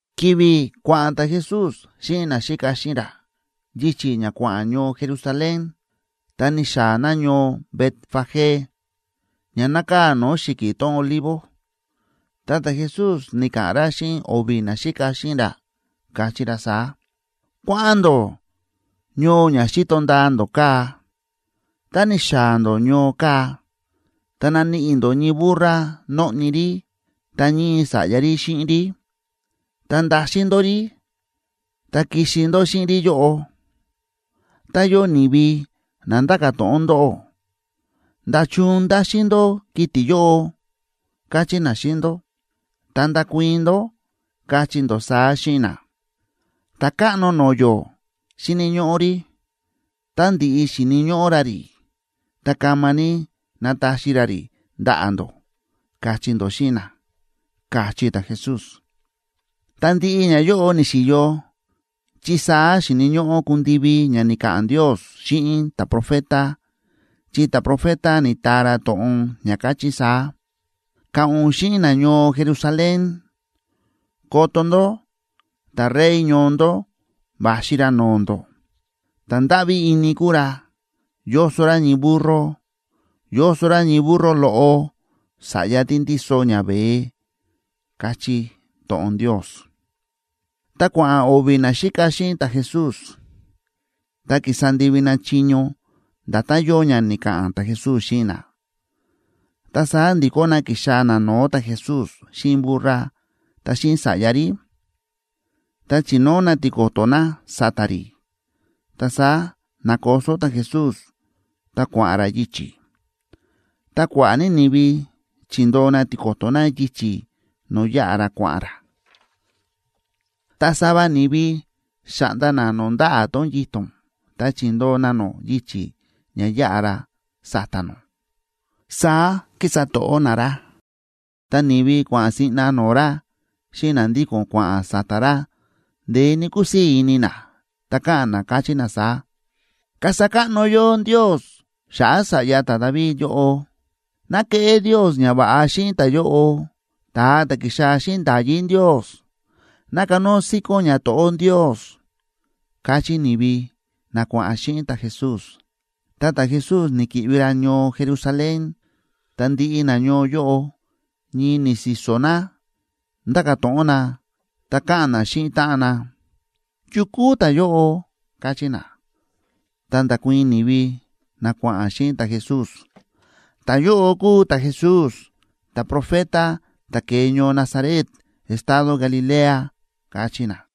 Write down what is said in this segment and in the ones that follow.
Ki̱vi̱ kua̱ꞌa̱n ta̱Jesús xíꞌin naxíka xíꞌin ra yichi̱ ña kua̱ꞌa̱n ñoo Jerusalén, ta ni̱xaa̱ na ñoo Betfagé, ña nákaa̱ no̱o̱ xi̱ki̱ tón Olivo. Ta ta̱Jesús ni̱ka̱ꞌa̱n ra xíꞌin o̱vi̱ naxíka xíꞌin ra, káchí ra saá: ―Kua̱ꞌa̱n ndó ñoo ña xíto ndaa ndó kaa̱. Tá ni̱xaa̱ ndó ñoo kaa̱, ta naníꞌi ndó ñii burra nóꞌni rí, ta ñii sa̱ꞌya rí xíꞌin rí. Ta ndaxin ndó rí ta kixi ndó xíꞌin rí yóꞌo. Tá yóo ni̱vi na nda̱ka̱ to̱ꞌon ndóꞌó: “¿Nda̱chun ndáxin ndó kiti̱ yóꞌo?”, kachí na xíꞌin ndó, ta ndakuii̱n ndó, kachí ndó saá xíꞌin na: “Ta̱káꞌno no̱o̱ yó xíni̱ ñóꞌó rí, tá ndi̱ꞌi xíni̱ ñóꞌó ra rí, ta kama ní nataxi ra rí ndaꞌa̱ ndó”, kachí ndó xíꞌin na ―káchí ta̱Jesús. Ta ndiꞌi ñayóꞌo ni̱xi̱yo, chi saá xíni̱ ñóꞌó kundivi ña ni̱ka̱ꞌa̱n Ndios xíꞌin ta̱profeta, chi ta̱profeta ni̱taa ra to̱ꞌon ña káchí saá: Ka̱ꞌa̱n ún xíꞌin nañoo Jerusalén:a “Koto ndó, ta̱Rey ñoo ndó va̱xi ra no̱o̱ ndó, ta̱ ndáꞌví ini kúu ra, yóso ra ñii burro, yóso ra ñii burro loꞌo, sa̱ꞌya tí ndíso ñaveé”, káchí to̱ꞌon Ndios. Ta kua̱ꞌa̱n o̱vi̱ naxíka xíꞌin ta̱Jesús, ta ki̱sa ndivi na chiño nda̱tán yóo ña ni̱ka̱ꞌa̱n ta̱Jesús xíꞌin na. Ta saá ndi̱kó na ki̱xaa̱ na no̱o̱ ta̱Jesús xíꞌin burra ta xíꞌin sa̱ꞌya rí. Ta chi̱nóo na tiko̱to̱ na sa̱ta̱ rí, ta saá na̱koso ta̱Jesús ta kua̱ꞌa̱n ra yichi̱. Ta kua̱ꞌa̱ ní ni̱vi chi̱ndoo na tiko̱to̱ na yichi̱ no̱o̱ yáꞌa ra kua̱ꞌa̱n ra, ta sava ni̱vi xa̱ꞌnda na no̱o̱ ndaꞌa̱ tón yito̱n ta chi̱ndoo na nó yichi̱ ña yaꞌa ra sa̱ta̱ nó, saá kísa to̱ꞌó na ra. Ta ni̱vi kua̱ꞌa̱n siꞌna no̱o̱ ra xíꞌin na ndíko̱n kua̱ꞌa̱n sa̱ta̱ ra, ndeé ní kúsii̱ ini na, ta káꞌa̱n na, káchí na saá: ―¡Kasa káꞌno yó Ndios xa̱ꞌa̱ sa̱ꞌya ta̱David yóꞌo! ¡Ná keꞌé Ndios ñava̱ꞌa xíꞌin ta̱yóꞌo, ta̱a ta̱ ki̱xaa̱ xíꞌin nda̱yí Ndios! ¡Ná kanóo síkón ñato̱ꞌó Ndios! ―káchí ni̱vi na kua̱ꞌa̱n xíꞌin ta̱Jesús. Ta ta̱Jesús ni̱ki̱ꞌvi ra ñoo Jerusalén, ta ndiꞌi nañoo yóꞌo ñii ni̱si̱so̱ na, ndáka̱ to̱ꞌon na ta káꞌa̱n na xíꞌin táꞌan na: ―¿Yu kúu ta̱yóꞌo? ―káchí na. Ta nda̱kuii̱n ni̱vi na kua̱ꞌa̱n xíꞌin ta̱Jesús: ―Ta̱yóꞌo kúu ta̱Jesús, ta̱profeta ta̱ ke̱e ñoo Nazaret estado Galilea ―káchí na.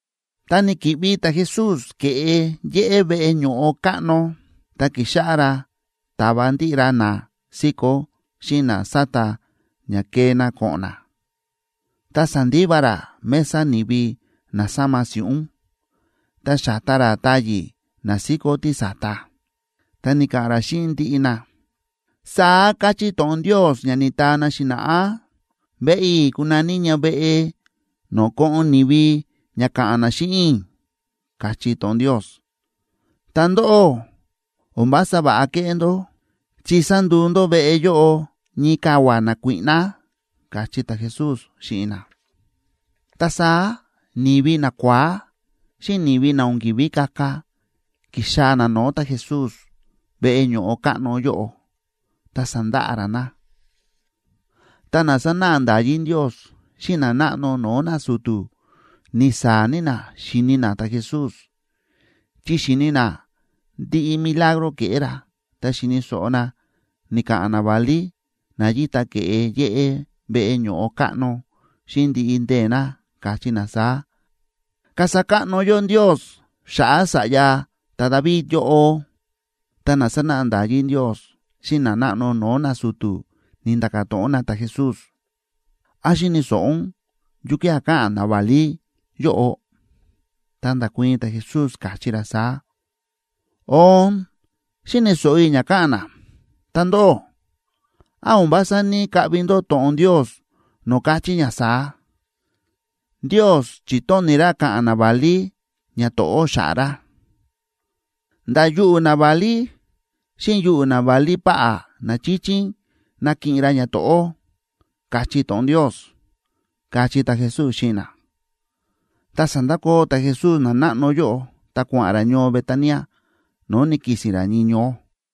Ta ni̱ki̱ꞌvi ta̱Jesús ke̱ꞌe yéꞌé veꞌe ño̱ꞌo káꞌno, ta ki̱xáꞌá ra táva ndiꞌi ra na síkó xíꞌin na sáta ña kee na ko̱ꞌo̱n na. Ta sa̱ndiva ra mesa ni̱vi na sáma si̱ꞌún, ta xa̱ta ra táyi̱ na síkó tísa̱ta. Ta ni̱ka̱ꞌa̱n ra xíꞌin ndiꞌi na: ―Saá káchí to̱ꞌon Ndios ña ni̱taa na xi̱na̱ꞌá: “Veꞌe i̱ kunaní ña veꞌe no̱o̱ ko̱ꞌo̱n ni̱vi ña ka̱ꞌa̱n na xíꞌin i̱”, káchí to̱ꞌon Ndios. Ta ndóꞌó, o̱n vása va̱ꞌa kéꞌé ndó, chi sa̱nduu ndó veꞌe yóꞌo ñii kavua̱ nakuíꞌná ―káchí ta̱Jesús xíꞌin na. Ta saá ni̱vi nakua̱á xíꞌin ni̱vi na o̱n ki̱ví kaka ki̱xaa̱ na no̱o̱ ta̱Jesús veꞌe ño̱ꞌo káꞌno yóꞌo, ta sa̱ndaꞌa ra na. Ta na sánáꞌa nda̱yí Ndios xíꞌin nanáꞌno no̱o̱ nasu̱tu̱ ni̱saa̱ ní na xíni na ta̱Jesús, chi xi̱ni na ndiꞌi milagro ke̱ꞌé ra, ta xi̱ni̱ so̱ꞌo na ni̱ka̱ꞌa̱n naválí na yíta ke̱ꞌe yéꞌé veꞌe ño̱ꞌo káꞌno, xíꞌin ndiꞌi ndee̱ na káchí na saá: ―¡Kasa káꞌno yó Ndios xa̱ꞌa̱ sa̱ꞌya ta̱David yóꞌo! Ta na sánáꞌa nda̱yí Ndios xíꞌin nanáꞌno no̱o̱ nasu̱tu̱ ni̱nda̱ka̱ to̱ꞌon na ta̱Jesús: ―¿Án xíni̱ so̱ꞌo ún yukía̱ káꞌa̱n naválí yóꞌo? Ta nda̱kuii̱n ta̱Jesús, káchí ra saá: ―Oon, xíni̱ so̱ꞌo i̱ ña káꞌa̱n na. Ta ndóꞌó, ¿án o̱n vása ní‑kaꞌvi ndó to̱ꞌon Ndios, no̱o̱ káchí ña saá?: Ndios chi̱tóni̱ ra ka̱ꞌa̱n naválí ñato̱ꞌó xa̱ꞌa̱ ra. Nda̱ yuꞌu̱ naválí xíꞌin yuꞌu̱ naválí páꞌá na chíchín nakiꞌin ra ñato̱ꞌó, káchí to̱ꞌon Ndios ―káchí ta̱Jesús xíꞌin na. Ta sa̱ndakoo ta̱Jesús nanáꞌno yóꞌo ta kua̱ꞌa̱n ra ñoo Betania, no̱o̱ ni̱ki̱si̱n ra ñii ñoó.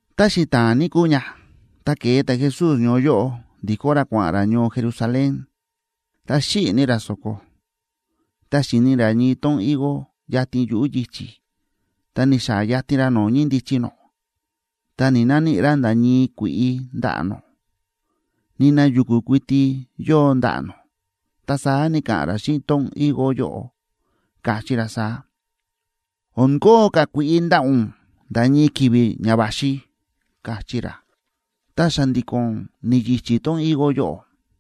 Ta xita̱a̱n ní kúu ña, ta ke̱e ta̱Jesús ñoo yóꞌo ndikó ra kua̱ꞌa̱n ra ñoo Jerusalén, ta xíꞌi̱ ní ra so̱ko. Ta xi̱ni ra ñii tón higo yatin yuꞌu̱ yichi̱, ta ni̱xaa̱ yatin ra no̱o̱ ñíndichi nó, ta ni̱‑naníꞌi ra nda̱ ñii kui̱ꞌi ndaꞌa̱ nó. Nina yu̱ku̱ kuiti yóo ndaꞌa̱ nó. Ta saá ni̱ka̱ꞌa̱n ra xíꞌin tón higo yóꞌo, káchí ra saá: ―O̱n koon ka̱ kui̱ꞌi ndaꞌa̱ ún nda̱ ñii ki̱vi̱ ña va̱xi ―káchí ra. Ta xa̱ndi̱ko̱n ni̱yichí tón higo yóꞌo.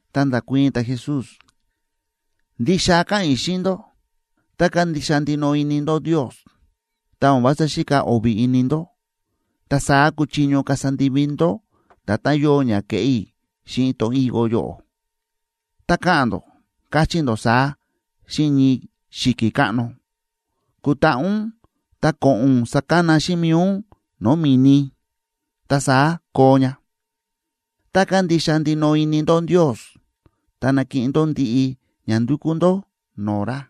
Ta nda̱kuii̱n ta̱Jesús: ―Ndixa káꞌa̱n i̱ xíꞌin ndó, tá kándixa ndinoꞌo ini ndó Ndios, ta o̱n vása xíka o̱vi̱ ini ndó, ta saá kuchiño kasa ndivi ndó nda̱tán yóo ña ke̱ꞌé i̱ xíꞌin tón higo yóꞌo. Tá ka̱ꞌa̱n ndó, kachí ndó saá xíꞌin ñii xi̱ki̱ káꞌno: “Kutaꞌa ún ta ko̱ꞌo̱n ún sakana xíꞌin mi̱i ún no̱o̱ mi̱ni”, ta saá koo ña. Tá kándixa ndinoꞌo ini ndó Ndios, ta nakiꞌin ndó ndiꞌi ña ndukú ndó no̱o̱ ra.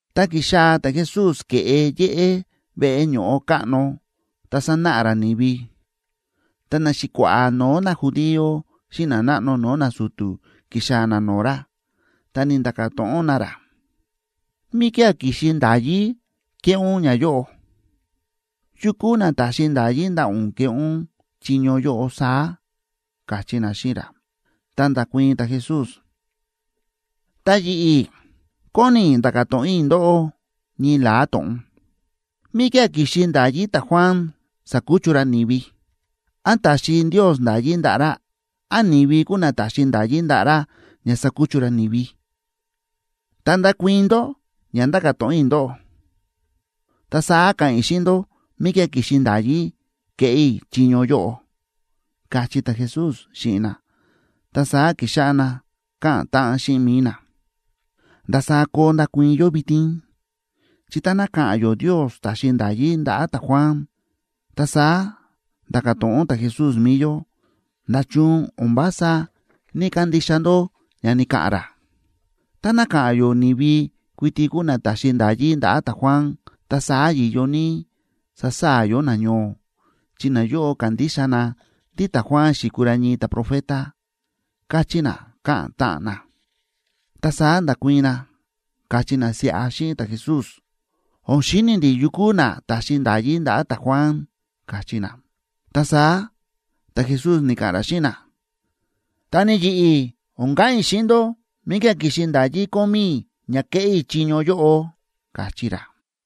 Ta ki̱xaa̱ ta̱Jesús ke̱ꞌe yéꞌé veꞌe ño̱ꞌo káꞌno ta sánáꞌa ra ni̱vi, ta naxi̱kua̱ꞌa̱ no̱o̱ najudío xíꞌin nanáꞌno no̱o̱ nasu̱tu̱ ki̱xaa̱ na no̱o̱ ra, ta ni̱nda̱ka̱ to̱ꞌon na ra: ―¿Míkía̱ ki̱xi nda̱yí kéꞌé ún ñayóꞌo? ¿Yu kúu na ta̱xi nda̱yí ndaꞌa̱ ún keꞌé ún chiño yóꞌo saá? ―káchí na xíꞌin ra. Ta nda̱kuii̱n ta̱Jesús: ―Ta yi̱ꞌi̱ kóni i̱ nda̱ka̱ to̱ꞌon i̱ ndóꞌó ñii la̱á to̱ꞌon. ¿Míkía̱ ki̱xi nda̱yí ta̱Juan sa̱kuchu ra ni̱vi? ¿Án ta̱xi Ndios nda̱yí ndaꞌa̱ ra? ¿Án ni̱vi kúu na ta̱xi nda̱yí ndaꞌa̱ ra ña sakuchu ra ni̱vi? Tá ndakuii̱n ndó ña ndáka̱ to̱ꞌon i̱ ndóꞌó, ta saá ka̱ꞌa̱n i̱ xíꞌin ndó míkía̱ ki̱xi nda̱yí kéꞌé i̱ chiño yóꞌo ―káchí ta̱Jesús xíꞌin na. Ta saá ki̱xáꞌá na káꞌa̱n táꞌan xíꞌin mi̱i na: ―¿Ndasaá koo ndakuii̱n yó vitin? Chi táná ka̱ꞌa̱n yó Ndios ta̱xi nda̱yí ndaꞌa̱ ta̱Juan, ta saá nda̱ka̱ to̱ꞌon ta̱Jesús mi̱i yó: “¿Nda̱chun o̱n vása ní‑kandixa ndó ña ni̱ka̱ꞌa̱n ra?” Táná ka̱ꞌa̱n yó ni̱vi kuiti kúu na ta̱xi nda̱yí ndaꞌa̱ ta̱Juan, ta saá yi̱yo ní sasaa̱ yó nañoo, chi nayóꞌo kándixa na ndí ta̱Juan xi̱kuu ra ñii ta̱profeta ―káchí na, káꞌa̱n táꞌan na. Ta saá nda̱kuii̱n na, káchí na siꞌa xíꞌin ta̱Jesús: ―O̱n xíni̱ ndi̱ yu kúu na ta̱xi nda̱yí ndaꞌa̱ ta̱Juan ―káchí na. Ta saá ta̱Jesús ni̱ka̱ꞌa̱n ra xíꞌin na: ―Ta ni yi̱ꞌi̱, o̱n ka̱ꞌa̱n i̱ xíꞌin ndó míkía̱ ki̱xi nda̱yí kómí i̱ ña kéꞌé i̱ chiño yóꞌo ―káchí ra.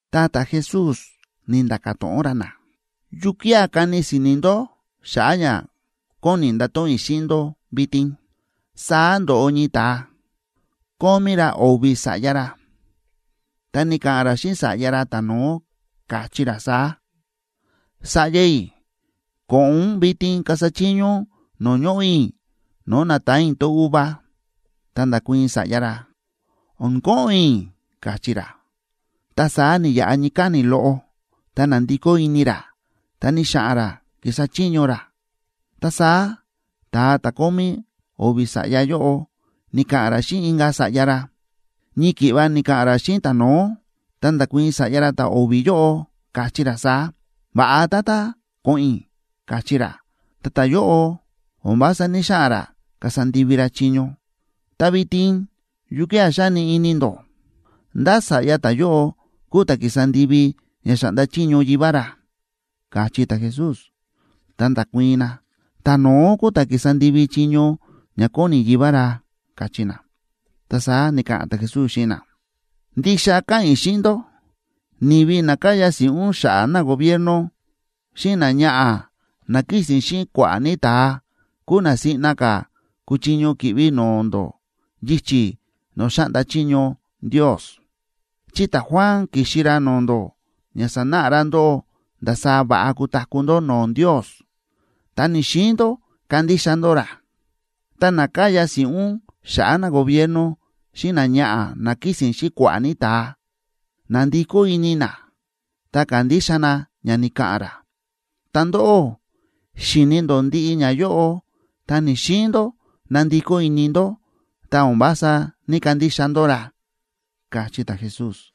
Ta ta̱Jesús ni̱nda̱ka̱ to̱ꞌon ra na: ―¿Yukía̱ kani si̱ni̱ ndó xa̱ꞌa̱ ña kóni i̱ ndato̱ꞌon i̱ xíꞌin ndó vitin? Saá ndo̱ꞌo ñii ta̱a, kómí ra o̱vi̱ sa̱ꞌya ra. Ta ni̱ka̱ꞌa̱n ra xíꞌin sa̱ꞌya ra ta̱no̱ó, káchí ra saá: “Sa̱ꞌya i̱, ko̱ꞌo̱n ún vitin kasa chiño ún no̱o̱ ñoꞌo̱ i̱ no̱o̱ na̱taan i̱ tón uva.” Ta nda̱kuii̱n sa̱ꞌya ra: “O̱n ko̱ꞌo̱n i̱”, káchí ra, ta saá ni̱yaꞌa ñii káni̱ loꞌo ta na̱ndikó ini ra, ta ni̱xa̱ꞌa̱n ra ki̱sa chiño ra. Ta saá ta̱a ta̱ kómí o̱vi̱ sa̱ꞌya yóꞌo ni̱ka̱ꞌa̱n ra xíꞌin inka̱ sa̱ꞌya ra, ñii ki̱ꞌva ni̱ka̱ꞌa̱n ra xíꞌin ta̱no̱ó. Ta nda̱kuii̱n sa̱ꞌya ra ta̱o̱vi̱ yóꞌo, káchí ra saá: “Va̱ꞌa, tata, ko̱ꞌo̱n i̱”, káchí ra, ta ta̱yóꞌo o̱n vása ní‑xaꞌa̱n ra kasa ndivi ra chiño. Ta vitin, ¿yukía̱ xáni ini ndó? ¿Ndá sa̱ꞌya ta̱yóꞌo kúu ta̱ ki̱sa ndivi ña xa̱ꞌnda chiño yivá ra? ―káchí ta̱Jesús. Ta nda̱kuii̱n na: ―Ta̱no̱ó kúu ta̱ ki̱sa ndivi chiño ña kóni yivá ra ―káchí na. Ta saá ni̱ka̱ꞌa̱n ta̱Jesús xíꞌin na: ―Ndixa káꞌa̱n i̱ xíꞌin ndó, ni̱vi na káya si̱ꞌún xa̱ꞌa̱ nagobierno, xíꞌin náñaꞌa̱ ná kísi̱n xíꞌin kua̱ꞌa̱ ní ta̱a, kúu na siꞌna ka̱ kúchiño ki̱ꞌvi no̱o̱ ndó yichi̱ no̱o̱ xáꞌnda chiño Ndios. Chi ta̱Juan ki̱xi ra no̱o̱ ndó ña sanáꞌa ra ndóꞌó ndasaá va̱ꞌa kutaku̱ ndó no̱o̱ Ndios, ta ni̱‑xiin ndó kandixa ndó ra. Ta na káya si̱ꞌún xa̱ꞌa̱ nagobierno xíꞌin náñaꞌa̱ ná kísi̱n xíꞌin kua̱ꞌa̱ ní ta̱a, na̱ndikó ini na ta ka̱ndixa na ña ni̱ka̱ꞌa̱n ra. Ta ndóꞌó xi̱ni ndó ndiꞌi ñayóꞌo, ta ni̱‑xiin ndó nandikó ini ndó, ta o̱n vása ní‑kandixa ndó ra ―káchí ta̱Jesús.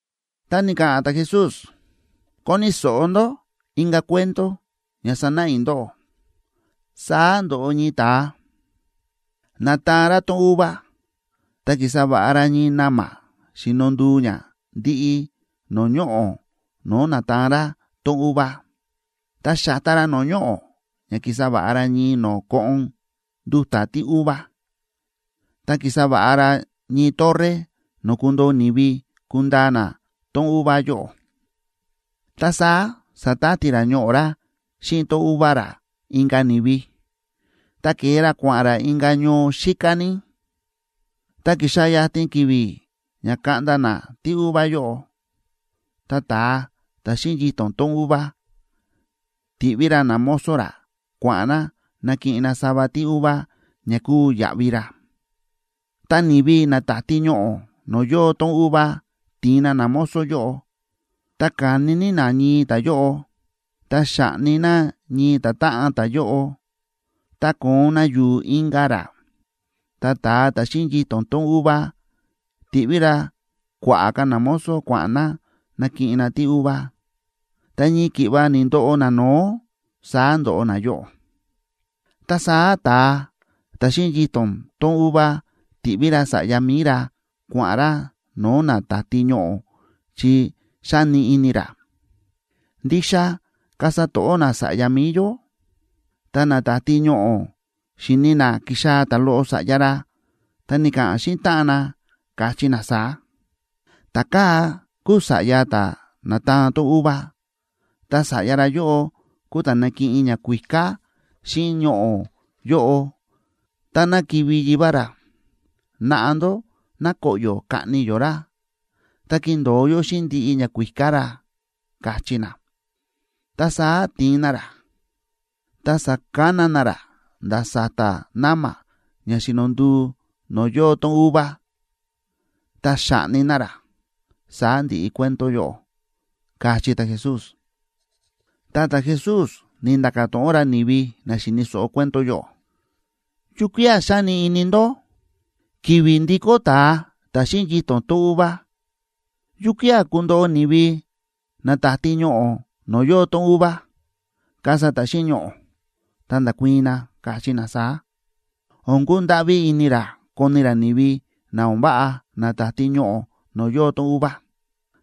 Ta ni̱ka̱ꞌa̱n ta̱Jesús: ―Koni̱ so̱ꞌo ndó inka̱ cuento ña sanáꞌa i̱ ndóꞌó. Saá ndo̱ꞌo ñii ta̱a, na̱taan ra tón uva. Ta ki̱sa va̱ꞌa ra ñii na̱ma̱ xíno nduu ña ndiꞌi no̱o̱ ñoꞌo̱ no̱o̱ na̱taan ra tón uva. Ta xa̱ta ra no̱o̱ ñoꞌo̱ ña ki̱sa va̱ꞌa ra ñii no̱o̱ koꞌon nduta̱ tíuva, ta ki̱sa va̱ꞌa ra ñii torre no̱o̱ kundoo ni̱vi kundaa na tón uva yóꞌo. ’Ta saá sa̱tati ra ñoꞌo̱ ra xíꞌin tón uva ra inka̱ ni̱vi, ta ke̱e ra kua̱ꞌa̱n ra inka̱ ñoo xíká ní. Ta ki̱xaa̱ yatin ki̱vi̱ ña kaꞌnda na tíuva yóꞌo, ta ta̱a ta̱ xíꞌin yito̱n tón uva ti̱ꞌví ra namozo ra kua̱ꞌa̱n na nakiꞌin na sava tíuva ña kuu yaꞌvi ra. Ta ni̱vi na táti ñoꞌo̱ no̱o̱ yóo tón uva ti̱in na namozo yóꞌo, ta ka̱ni ní na ñii ta̱yóꞌo, ta xa̱ꞌni na ñii ta̱táꞌan ta̱yóꞌo, ta ko̱on na yu̱u̱ inka̱ ra. Ta ta̱a ta̱ xíꞌin yito̱n tón uva ti̱ꞌví ra kua̱ꞌa̱ ka̱ namozo kua̱ꞌa̱n na nakiꞌin na tíuva, ta ñii ki̱ꞌva ni̱ndoꞌo nano̱ó, saá ndóꞌo nayóꞌo. ’Ta saá ta̱a ta̱ xíꞌin yito̱n tón uva ti̱ꞌví ra sa̱ꞌya mi̱i ra kua̱ꞌa̱n ra no̱o̱ na táti ñoꞌo̱, chi xa̱ni ini ra: “Ndixa kasa to̱ꞌó na sa̱ꞌya mi̱i yó.” Ta na táti ñoꞌo̱ xi̱ni na kíxaa̱ ta̱loꞌo sa̱ꞌya ra, ta ni̱ka̱ꞌa̱n na xíꞌin táꞌan na, káchí na saá: “Ta̱kaa̱ kúu sa̱ꞌya ta̱ na̱taan tón uva, ta sa̱ꞌya ra yóꞌo kúu ta̱ nakiꞌin ñakuíká xíꞌin ñoꞌo̱ yóꞌo táná kivi̱ yivá ra. Naꞌa ndó ná koꞌyo̱ kaꞌni yó ra, ta kindo̱o yó xíꞌin ndiꞌi ñakuíká ra”, káchí na. Ta saá ti̱in na ra, ta sa̱kana na ra nda̱ sa̱ta̱ na̱ma̱ ña xíno nduu no̱o̱ yóo tón uva, ta xa̱ꞌni na ra. Saá ndi̱ꞌi cuento yóꞌo ―káchí ta̱Jesús. Ta ta̱Jesús ni̱nda̱ka̱ to̱ꞌon ra ni̱vi na xi̱ni̱ so̱ꞌo cuento yóꞌo: ―¿Yukía̱ xáni ini ndó? Ki̱vi̱ ndikó ta̱a ta̱ xíꞌin yito̱n tón uva, ¿yukía̱ kundoꞌo ni̱vi na táti ñoꞌo̱ no̱o̱ yóo tón uva, kasa ta̱ xíꞌin ñoꞌo̱? Ta nda̱kuii̱n na, káchí na saá: ―O̱n kundáꞌví ini ra koni ra ni̱vi na o̱n váꞌa na táti ñoꞌo̱ no̱o̱ yóo tón uva,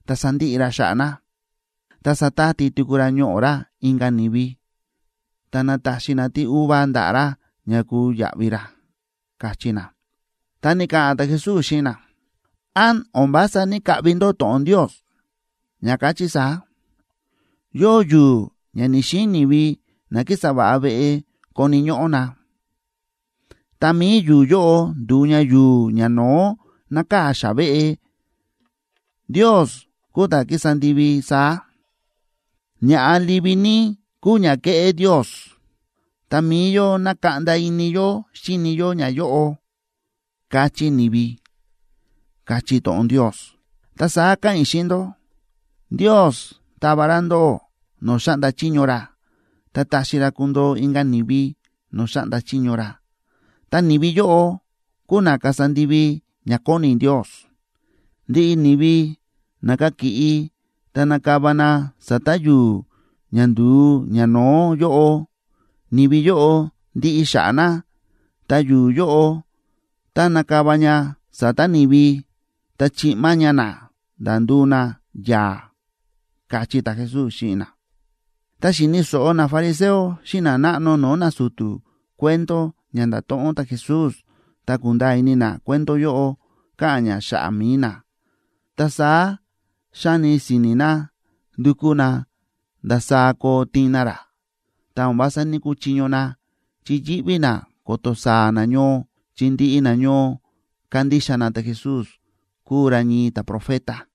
ta sandiꞌi ra xa̱ꞌa̱ na. Ta satati tuku ra ñoꞌo̱ ra inka̱ ni̱vi, ta nataxi na tíuva ndaꞌa̱ ra ña kuu yaꞌvi ra ―káchí na. Ta ni̱ka̱ꞌa̱n ta̱Jesús xíꞌin na: ―¿Án o̱n vása ní‑kaꞌvi ndó to̱ꞌon Ndios, ña káchí saá?: Yóo yu̱u̱ ña ni̱‑xiin ni̱vi na kísa va̱ꞌa veꞌe koni̱ ñóꞌó na, ta mi̱i yu̱u̱ yóꞌo ndu̱u ña yu̱u̱ ñano̱ó nákaa̱ xa̱ꞌa̱ veꞌe. Ndios kúu ta̱ ki̱sa ndivi saá, ña̱ꞌa livi ní kúu ña ke̱ꞌé Ndios, ta mi̱i yó na̱kaꞌnda ini yó xíni yó ñayóꞌo, káchí ni̱vi, káchí to̱ꞌon Ndios. Ta saá káꞌa̱n i̱ xíꞌin ndó, Ndios tava ra ndóꞌó no̱o̱ xáꞌnda chiño ra, ta taxi ra kundoo inka̱ ni̱vi no̱o̱ xáꞌnda chiño ra, ta ni̱vi yóꞌo kúu na kasa ndivi ña kóni Ndios. Ndiꞌi ni̱vi na kakiꞌi ta nakava na sa̱ta̱ yu̱u̱ ña nduu ñano̱ó yóꞌo, ni̱vi yóꞌo ndiꞌi xa̱ꞌa̱ na; ta yu̱u̱ yóꞌo, tá nakava ña sa̱ta̱ ni̱vi, ta chiꞌma ña na, nda̱ nduu na yaa̱ ―káchí ta̱Jesús xíꞌin na. Ta xi̱ni̱ so̱ꞌo nafariseo xíꞌin nanáꞌno no̱o̱ nasu̱tu̱ cuento ña nda̱to̱ꞌon ta̱Jesús, ta ku̱nda̱a̱ ini na cuento yóꞌo káꞌa̱n ña xa̱ꞌa̱ mi̱i na. Ta saá xa̱ni si̱ni̱ na ndu̱kú na ndasaá koo tiin na ra, ta o̱n vása ní‑kuchiño na, chi yíꞌví na ko̱to̱ saa̱ nañoo, chi ndiꞌi nañoo kándixa na ta̱Jesús kúu ra ñii ta̱profeta.